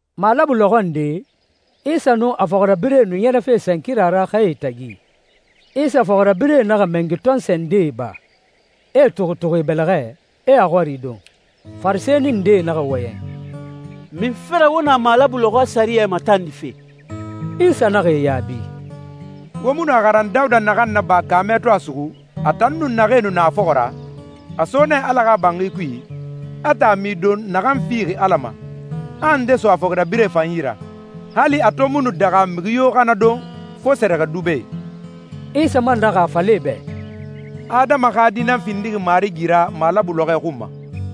Malabu lɔxɔ nde, Isa nun a fɔxirabirɛe nu ɲɛrɛfe sankira ra xɛe tagi. Isa fɔxirabirɛe naxa mɛngi tɔnsɔɛ ndee ba, e e tuxutuxu e bɛlɛxɛ, e a xɔrie don. Farisɛni ndee naxa wɔyɛn, «Munfe ra wo na malabu lɔxɔɛ sɛriyɛ matandife?» Isa naxa e yaabi, «Wo mu nu a xaran Dawuda naxan naba kaamɛ to a suxu, a tan nun naxee nu na a fɔxɔ ra? A so nɛ Ala xa banxi kui, a taami don naxan fixi Ala ma, a nde so a fɔxirabirɛe fan yi ra, hali a to mu nu daxa mixi yo xa na don, fo sɛrɛxɛdubɛe.» Isa man naxa a fala e bɛ, «Adama xa Di nan findixi marigi ra malabu lɔxɔɛ xun ma.»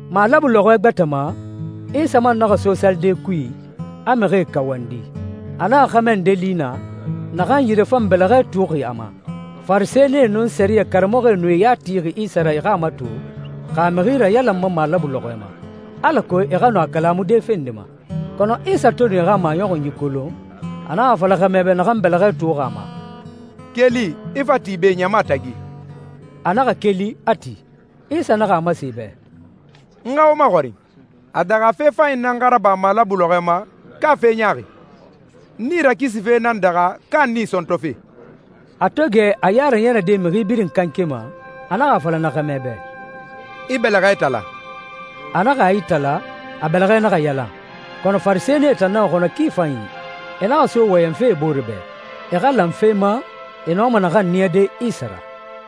Malabu lɔxɔɛ gbɛtɛ ma, Isa man naxa so salide kui, a mixie kawandi. A naxa xɛmɛ nde li naa, naxan yire fan bɛlɛxɛ tuuxi a ma. Farisɛnie nun sɛriyɛ karamɔxɔe nu e ya tixi Isa ra e xa a mato xa a mixi rayalanma malabu lɔxɔɛ ma, alako e xa nɔ a kalamude fe nde ma. Kɔnɔ Isa to nu e xa maɲɔxunyi kolon, a naxa a fala xɛmɛ bɛ naxan bɛlɛxɛ tuuxi a ma, «Keli, i fa ti be ɲama tagi.» A naxa keli, a ti. Isa naxa a masen e bɛ, «N xa wo maxɔrin. A daxa fe fanyi nan xa raba malabu lɔxɔɛ ma, ka fe ɲaaxi? Nii rakisife nan daxa ka nii sɔntɔfe?» A to gɛ a ya raɲɛrɛde mixi birin kanke ma, a naxa a fala na xɛmɛ bɛ, «I bɛlɛxɛ itala.» A naxa a itala, a bɛlɛxɛ naxa yalan. Kɔnɔ Farisɛnie tan naxa xɔnɔ ki fanyi. E naxa so wɔyɛnfe e bore bɛ, e xa lan fe ma, e nɔma naxan niyade Isa ra.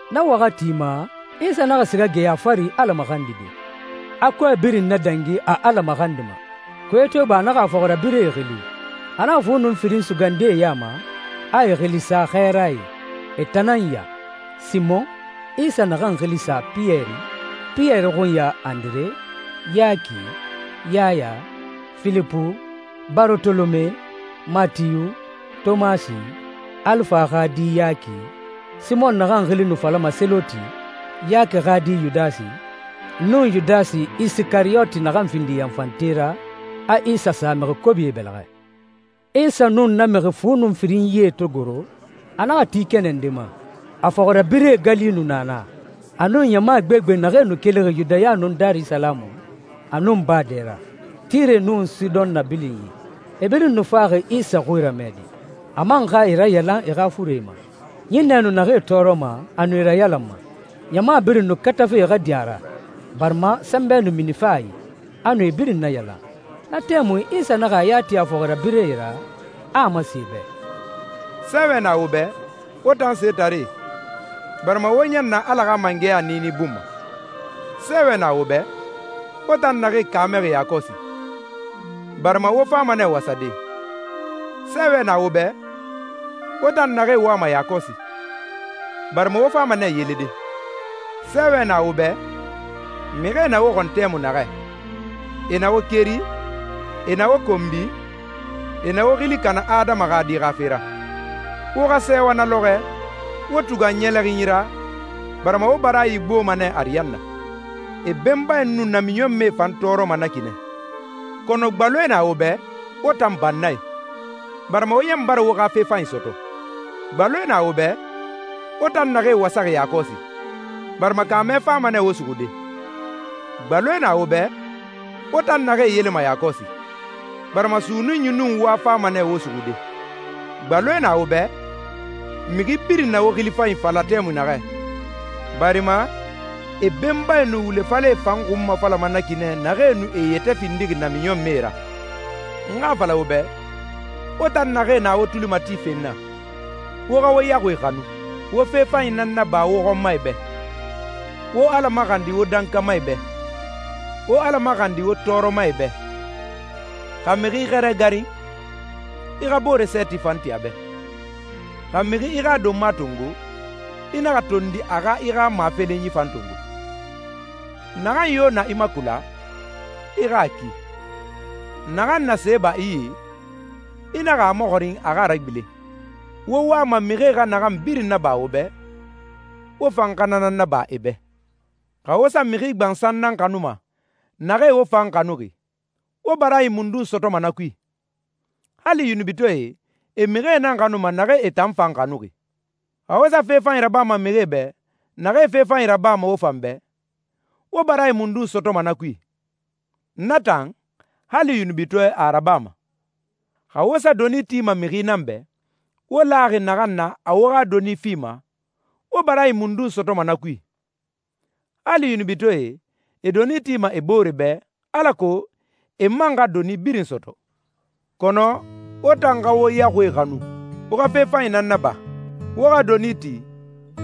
Na waxati ma, Isa naxa siga geya fari Ala maxandide, a kɔɛ birin nadangi a Ala maxandima. Kuye to iba a naxa a fɔxirabirɛe xili. A naxa fu nun firin sugandi e ya ma, a e xili sa xɛɛrae. E tan nan ya: Simɔn, Isa naxan xili sa Piyɛri, Piyɛri xunya Andire, Yaki, Yaya, Filipu, Barotolome, Matiyu, Tomasi, Alifa xa di Yaki, Simɔn naxan xili nu falama Seloti, Yaki xa di Yudasi, nun Yudasi Isikariyoti naxan findi yanfante ra, a Isa sa mixi kobie bɛlɛxɛ. Isa nun na mixi fu nun firinyie to goro, a naxa ti kɛnɛ nde ma. A fɔxirabirɛe gali nu na naa, a nun ɲama gbegbe naxee nu kelixi Yudaya nun Darisalamu, a nun baa dɛ ra, Tire nun Sidɔn nabilinyi. E birin nu faxi Isa xui ramɛde, a man xa e rayalan e xa furee ma. Ɲinnɛ nu naxee tɔɔrɔma, a nu e rayalanma. Ɲama birin nu katafe e xa din a ra, barima sɛnbɛ nu minife a i, a nu e birin nayalan. Na tɛmui Isa naxa a ya ti a fɔxirabirɛe ra, a a masen e bɛ, «Sɛɛwɛ na wo bɛ, wo tan setaree, barima wo ɲan na Ala xa mangɛya niini bun ma. Sɛɛwɛ na wo bɛ, wo tan naxee kaamɛxi yakɔsi, barima wo fama nɛ wasade. Sɛɛwɛ na wo bɛ, wo tan naxee wama yakɔsi, barima wo fama nɛ yelede. Sɛɛwɛ na wo bɛ, mixie na wo xɔn tɛmui naxɛ, e na wo keri, e na wo konbi, e na wo xili kana Adama xa Di xa fe ra. Wo xa sɛɛwa na lɔxɔɛ, wo tugan ɲɛlɛxinyi ra, barima wo baraayi gboma nɛ ariyanna. E benbae nu namiɲɔnmɛe fan tɔɔrɔma na ki nɛ.» «Kɔnɔ gbaloe na wo bɛ, wo tan bannae, barima wo ɲan bara wo xa fe fanyi sɔtɔ. Gbaloe na wo bɛ, wo tan naxee wasaxi yakɔsi, barima kaamɛ fama nɛ wo suxude. Gbaloe na wo bɛ, wo tan naxee yelema yakɔsi, barima sunnunyi nun wa fama nɛ wo suxude. Gbaloe na wo bɛ, mixi birin na wo xili fanyi fala tɛmui naxɛ, barima e benbae nu wule falɛe fan xunmafalama na ki nɛ naxee nu e yɛtɛ findixi namiɲɔnmɛe ra.» «N xa a fala wo bɛ, wo tan naxee na wo tuli matife n na, wo xa wo yaxuie xanu, wo fe fanyi nan naba wo xɔnmae bɛ, wo Ala maxandi wo dankamae bɛ, wo Ala maxandi wo tɔɔrɔmae bɛ. Xa mixi i xɛrɛ garin, i xa boore sɛɛti fan ti a bɛ. Xa mixi i xa donma tongo, i naxa tondi a xa i xa mafelenyi fan tongo. Naxan yo na i makula, i xa a ki. Naxan na see ba i yi, i naxa a maxɔrin a xa a ragbilen. Wo wama mixie xa naxan birin naba wo bɛ, wo fan xa na nan naba e bɛ.» «Xa wo sa mixi gbansan nan xanuma, naxee wo fan xanuxi, wo baraayi mundun sɔtɔma na kui? Hali yunubitɔɛe, e mixie nan xanuma naxee e tan fan xanuxi. Xa wo sa fe fanyi rabama mixie bɛ, naxee fe fanyi rabama wo fan bɛ, wo baraayi mundun sɔtɔma na kui? Na tan, hali yunubitɔɛ a rabama. Xa wo sa doni tima mixi nan bɛ, wo laxi naxan na a wo xa doni fima, wo baraayi mundun sɔtɔma na kui? Hali yunubitɔɛe, e doni tima e boore bɛ, alako e man xa doni birin sɔtɔ. Kɔnɔ wo tan xa wo yaxuie xanu. Wo xa fe fanyi nan naba. Wo xa doni ti,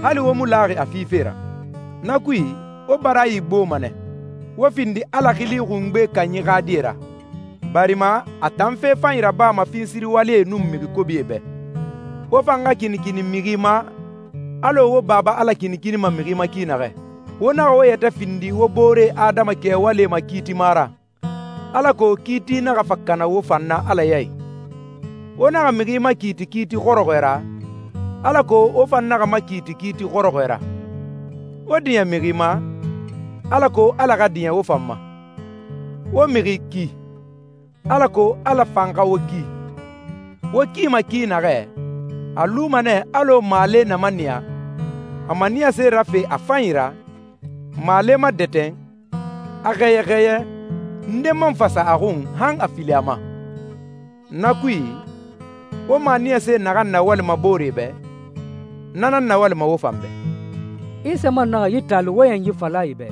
hali wo mu laxi a fife ra. Na kui, wo baraayi gboma nɛ, wo findi Ala Xili Xungbe Kanyi xa die ra, barima a tan fe fanyi rabama finsiriwalie nun mixi kobie bɛ. Wo fan xa kinikini mixi ma, alɔ wo Baba Ala kinikinima mixi ma ki naxɛ.» «Wo naxa wo yɛtɛ findi wo boore adama kɛwalie makiitima ra, alako kiiti naxa fa kana wo fan na Ala yi. Wo naxa mixi makiiti kiiti xɔrɔxɔɛ ra, alako wo fan naxa makiiti kiiti xɔrɔxɔɛ ra. Wo diɲɛ mixi ma, alako Ala xa diɲɛ wo fan ma. Wo mixi ki, alako Ala fan xa wo ki. Wo kima ki naxɛ, a luma nɛ alɔ maale na maniya, a maniyase rafe a fanyi ra, maale madɛtɛn, a xɛyɛ xɛyɛ, nde man fa sa a xun han a fili a ma. Na kui, wo maniyase naxan nawalima booree bɛ, na nan nawalima wo fan bɛ.» Isa man naxa yi taali wɔyɛnyi fala e bɛ,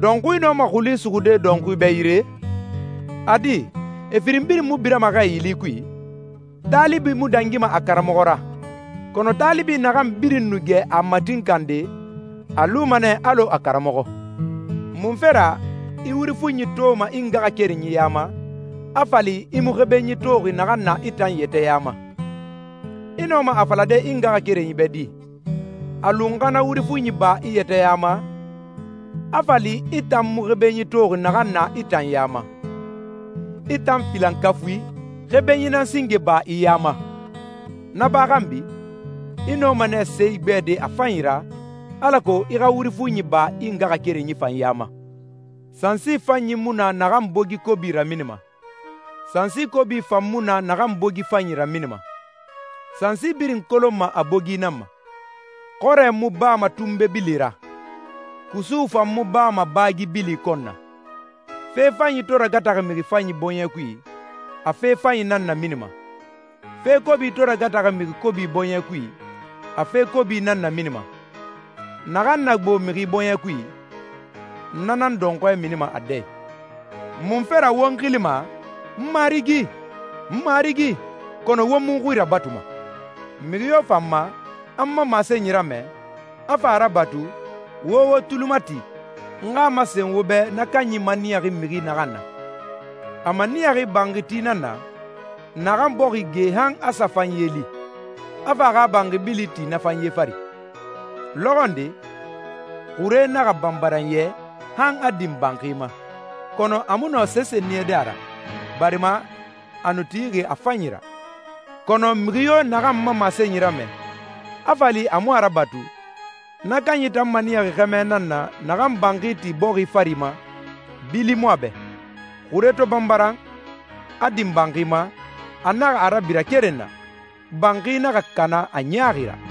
«Dɔnxui nɔma xuli suxude dɔnxui bɛ yire? A di, e firin birin mu birama xɛ yili kui? Taalibi mu dangima a karamɔxɔ ra, kɔnɔ taalibi naxan birin nu gɛ a matinkande, a luma nɛ alɔ a karamɔxɔ.» «Munfe ra i wuri fuɲi toma i ngaxakerenyi ya ma, a fa li i mu xebenyi toxi naxan na i tan yɛtɛ ya ma? I nɔma a falade i ngaxakerenyi bɛ di, ‹A lu n xa na wuri fuɲi ba i yɛtɛ ya ma,› a fa li i tan mu xebenyi toxi naxan na i tan ya ma? I tan filankafui, xebenyi nan singe ba i ya ma! Na ba xanbi, i nɔma nɛ se igbɛde a fanyi ra, alako i xa wuri fuɲi ba i ngaxakerenyi fan ya ma.» «Sansi fanyi mu na naxan bogi kobi raminima, sansi kobi fan mu na naxan bogi fanyi raminima. Sansi birin kolonma a bogi nan ma. Xɔrɛ mu bama tunbe bili ra, kusu fan mu bama baagi bili kɔn na. Fe fanyi to ragataxi mixi fanyi bɔɲɛ kui, a fe fanyi nan naminima. Fe kobi to ragataxi mixi kobi bɔɲɛ kui, a fe kobi nan naminima. Naxan na gbo mixi bɔɲɛ kui, na nan dɔnxɔɛ minima a dɛ i.» «Munfe ra wo n xilima ‹N Marigi, n Marigi,› kɔnɔ wo mu n xui rabatuma? Mixi yo fa n ma, a n ma masenyi ramɛ, a fa a rabatu, wo wo tuli mati n xa a masen wo bɛ na kanyi maniyaxi mixi naxan na. A maniyaxi banxiti nan na, naxan bɔxi ge han a sa fanye li, a fa a xa banxi bili ti na fanye fari. Lɔxɔ nde, xure naxa banbaran yɛ han a din banxi ma, kɔnɔ a mu nɔ sese niyade a ra, barima a nu tixi a fanyi ra. Kɔnɔ mixi yo naxan n ma masenyi ramɛ, a fa li a mu a rabatu, na kanyi tan maniyaxi xɛmɛ nan na naxan banxi ti bɔxi fari ma, bili mu a bɛ. Xure to banbaran, a din banxi ma, a naxa a rabira keren na, banxi naxa kana a ɲaaxi ra.»